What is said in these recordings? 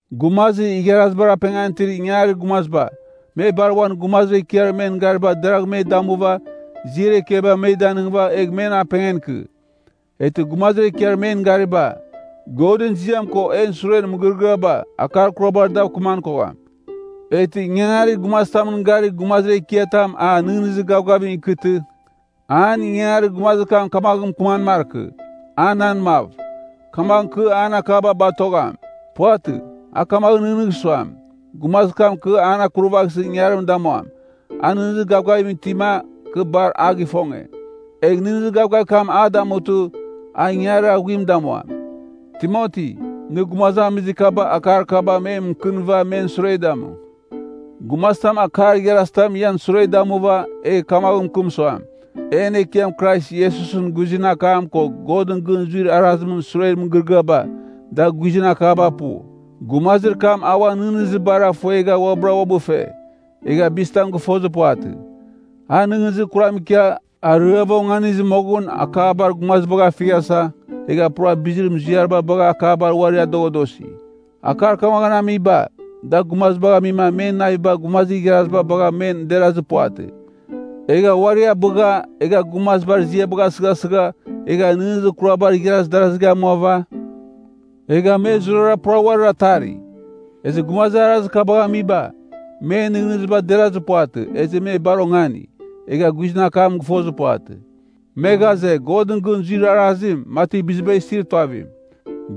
Gumazir igharazibar apengan itir ingangarir gumaziba, me bar uan gumazir ekiar men gariba deragh me damuva, ziar ekiaba me danɨngɨva egh men apengan ikɨ. Eghtɨ gumazir ekiar men gariba, Godɨn ziam ko en suren mɨgɨrɨgɨaba, akar kurabar dav kɨman kogham. Eghtɨ ingangarir gumazitamɨn garir gumazir ekiatam a nɨghnɨzir gavgavim ikɨtɨ, an inganganir gumazir kam kamaghɨn mɨkɨman markɨ, a nan mav, kamaghɨn kɨ an akaba batogham. Puvatɨ, a kamaghɨn nɨghnɨgh suam, gumazir kam kɨ an akurvaghsɨ ingangarim damuam, a nɨghnɨzir gavgavim itima, kɨ bar a gifonge. Egh nɨghnɨzir kam a damutɨ, a ingangarir aghuim damuam. Timoti, nɨ gumazamiziba akar kaba me mɨkɨnɨva men sure damu. Gumazitam akar igharizitam ian sure damuva, egh kamaghɨn mɨkɨm suam, En Ekiam Krais Iesusɨn guizɨn akam ko Godɨn gɨn zuir arazimɨn suren mɨgɨrɨgɨaba, da guizɨn akaba pu, gumazir kam uan nɨghnɨzibara ifuegha uabɨra uabɨ fe, egha bizitam gɨfozir puvatɨ. A nɨghnɨzir kuram ikia, ariava onganizɨ moghɨn, akabar gumazibagh afighasa, egha pura bizir muziariba bagha akabar uari adoghadosi. Akar kamaghɨn amiba, da gumazibagh amima men naviba gumazir igharaziba bagha men derazir puvatɨ, egha uari abɨgha, egha gumazibar ziabagh asɨghasɨgha, egha nɨghnɨzir kurabar igharaz darazigh amuava, egha me zurara pura uarir atari. Ezɨ gumazir arazir kabagh amiba, men nɨghnɨziba derazir puvatɨ, ezɨ me bar ongani, egha guizɨn akam gɨfozir puvatɨ. Me ghaze, Godɨn gɨn zuir arazim, mati biziba isir tuavim.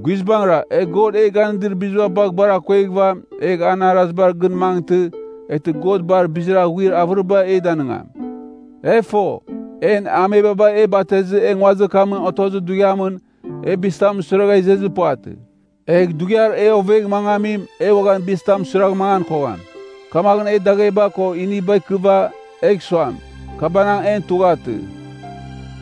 Guizbangɨra, e God e ganɨdir biziba bagh bar akueghɨva, egh an arazibar gɨn mangɨtɨ, eghtɨ God bar bizir aghuir avɨriba e danɨngam. E fo, en amebaba e batezɨ e nguazir kamɨn otozir dughiamɨn, e bizitam suiragha izezir puvatɨ. Egh dughiar e ovegh mangamim, e uaghan bizitam suiragh mangan kogham. Kamaghɨn e dagheba ko iniba ikɨva, egh suam, “Kabanang, en tughatɨ.”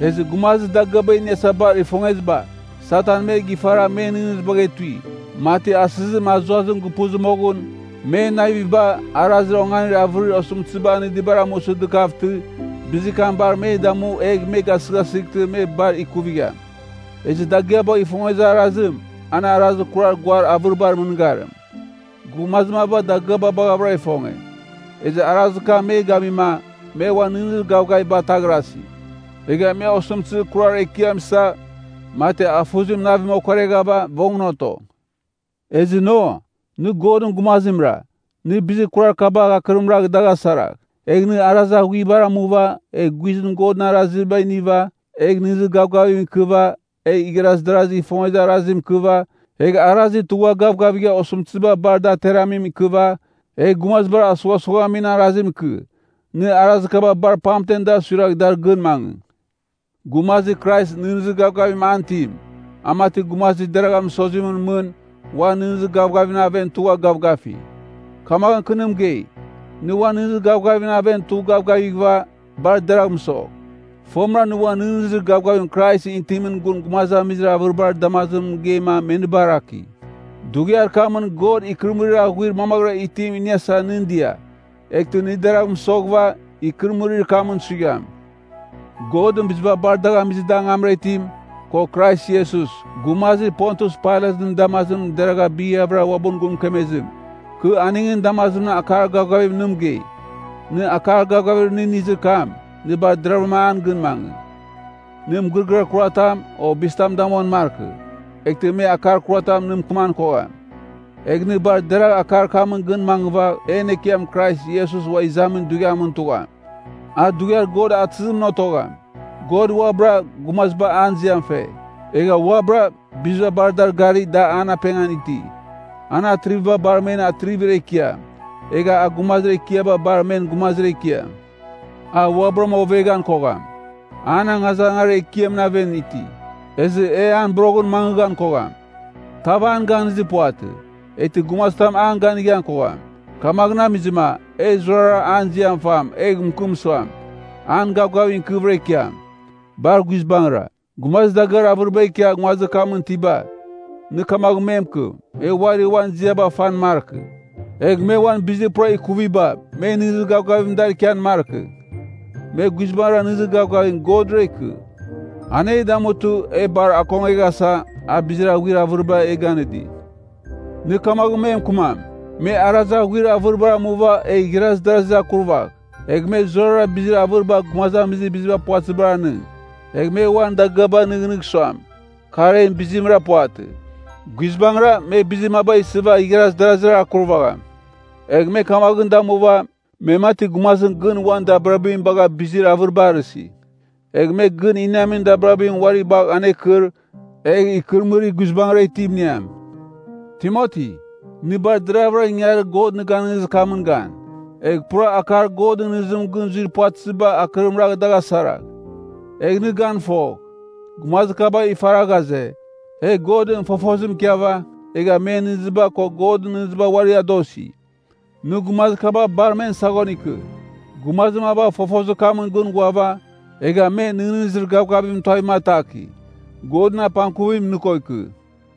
Ezɨ gumazir dagɨaba iniasa bar ifongeziba, Satan me gifara men nɨghnɨzibagh etui, mati asɨzim azuazim gupuzɨ moghɨn, men naviba, arazir onganir avɨrir osɨmtɨziba anɨdibar amusɨ dɨkavtɨ, bizir kam bar me damu egh me gasɨghasɨghtɨ me bar ikuvigham. Ezɨ dagɨabagh ifongezir arazim, an arazir kurar guar avɨribar mɨngarim. Gumazir maba dagɨaba baghavɨra ifonge, ezɨ arazir kam me gamima, me uan nɨghnɨzir gavgaviba ataghrasi. Egha me osɨmtɨzir kurar ekiam isa, mati afuzim navim okoreghava vongɨn oto. Ezɨ no, nɨ Godɨn gumazimra, nɨ bizir kurar kaba akɨrim ragh dagh asaragh. Egh nɨ arazir aghuibar amuva, egh guizɨn Godɨn araziba iniva, egh nɨghnɨzir gavgavim ikɨva, egh igharaz darazigh ifongezir arazim ikɨva, egh arazir tugha gavgavigha osɨmtɨziba bar da ateramim ikɨva, egh gumazibar asughasughamin arazim ikɨ. Nɨ arazir kaba bar pamtem dar suiragh dar gɨn mangɨ. Gumazir Krais nɨghnɨzir gavgavim an itim, a mati gumazir deragha mɨsozimɨn mɨn, uan nɨghnɨzir gavgavimɨn aven tugha gavgafi. Kamaghɨn kɨ nɨ mɨgei, nɨ uan nɨghnɨzir gavgavimɨn aven tugh gavgavighɨva, bar deragh mɨsogh. Fomɨra nɨ uan nɨghnɨzir gavgavir Kraisɨn itimɨn gun gumazamizir avɨribar damazimɨn mɨgeima me nɨ baraki. Dughiar kamɨn God ikɨrɨmɨrir aghuir mamaghɨra itim iniasa nɨn dia. Eghtɨ nɨ deragh mɨsoghɨva, ikɨrɨmɨrir kamɨn suigham. Godɨn biziba bar dagh amizɨ da angamra itim, ko Krais Iesus, gumazir Pontius Pailatɨn damazimɨn deragha bighavɨra uabɨn gun mɨkemezim, kɨ aningɨn damazimɨn akar gavgavim nɨ mɨgei. Nɨ akar gavgavir nɨ inizir kam, nɨ bar deravɨram an gɨn mangɨ. Nɨ mɨgɨrɨgɨar kuratam, o bizitam damuan markɨ, eghtɨ me akar kuratam nɨ mɨkɨman kogham. Egh nɨ bar deragh akar kamɨn gɨn mangɨva en Ekiam Krais Iesus ua izamin dughiamɨn tugham. A dughiar God atɨzimɨn otogham. God uabɨra, gumaziba an ziam fe. Egha uabɨra, biziba bar dar gari da an apengan iti. An Atriviba bar men Atrivir Ekiam, egha a Gumazir Ekiaba Bar men Gumazir Ekiam. A uabɨram oveghan kogham. An angazangarir ekiamɨn aven iti, ezɨ e an boroghɨn mangɨghan kogham. Tav an ganizir puvatɨ. Eghtɨ gumazitam an ganighan kogham. Kamaghɨn amizɨma, e zurara an ziam fam, egh mɨkɨm suam, an gavgavim ikɨvɨra ikiam. Bar guizbangɨra! Gumazir dagɨar avɨriba ikia nguazir kamɨn itiba, nɨ kamaghɨn me mɨkɨm, me uari uan ziaba fan markɨ. Egh me uan bizir pura ikuviba me nɨghnɨzir gavgavim dar ikian markɨ. Me guizbangɨra nɨghnɨzir gavgavim Godra ikɨ. An e damutɨ, e bar akongeghasa, a bizir aghuir avɨriba e ganɨdi. Nɨ kamaghɨn me mɨkɨmam, me arazir aghuir avɨribar amuva egh igharaz darazir akurvagh. Egh me zurara bizir avɨriba gumazamizir biziba puvatɨziba anɨng. Egh me uan dagɨabagh nɨghnɨgh suam, kar en bizimra puvatɨ. Guizbangɨra, me bizir maba isɨva igharaz darazir akurvagham. Egh me kamaghɨn damuva, me mati gumazim gɨn uan dabirabim bagha bizir avɨriba arɨsi. Egh me gɨn iniamin dabirabim uari bagh anerkɨr, egh ikɨrɨmɨrir guizbangɨra itim iniam. Timoti, nɨ bar deravɨra ingangarir God nɨ ganɨngizir kamɨn gan. Egh pura akar Godɨn nɨghnɨzimɨn gɨn zuir puvatɨziba akɨrim ragh dagh asaragh. Egh nɨ gan fogh, gumazir kaba ifara ghaze, e Godɨn fofozim ikiava, egha men nɨghnɨziba ko Godɨn nɨghnɨziba uari adosi. Nɨ gumazir kaba bar men saghon ikɨ. Gumazir maba fofozir kamɨn gɨn ghuava, egha me nɨghnɨzir gavgavimɨn tuavim ataki. Godɨn apangkuvim nɨ ko ikɨ.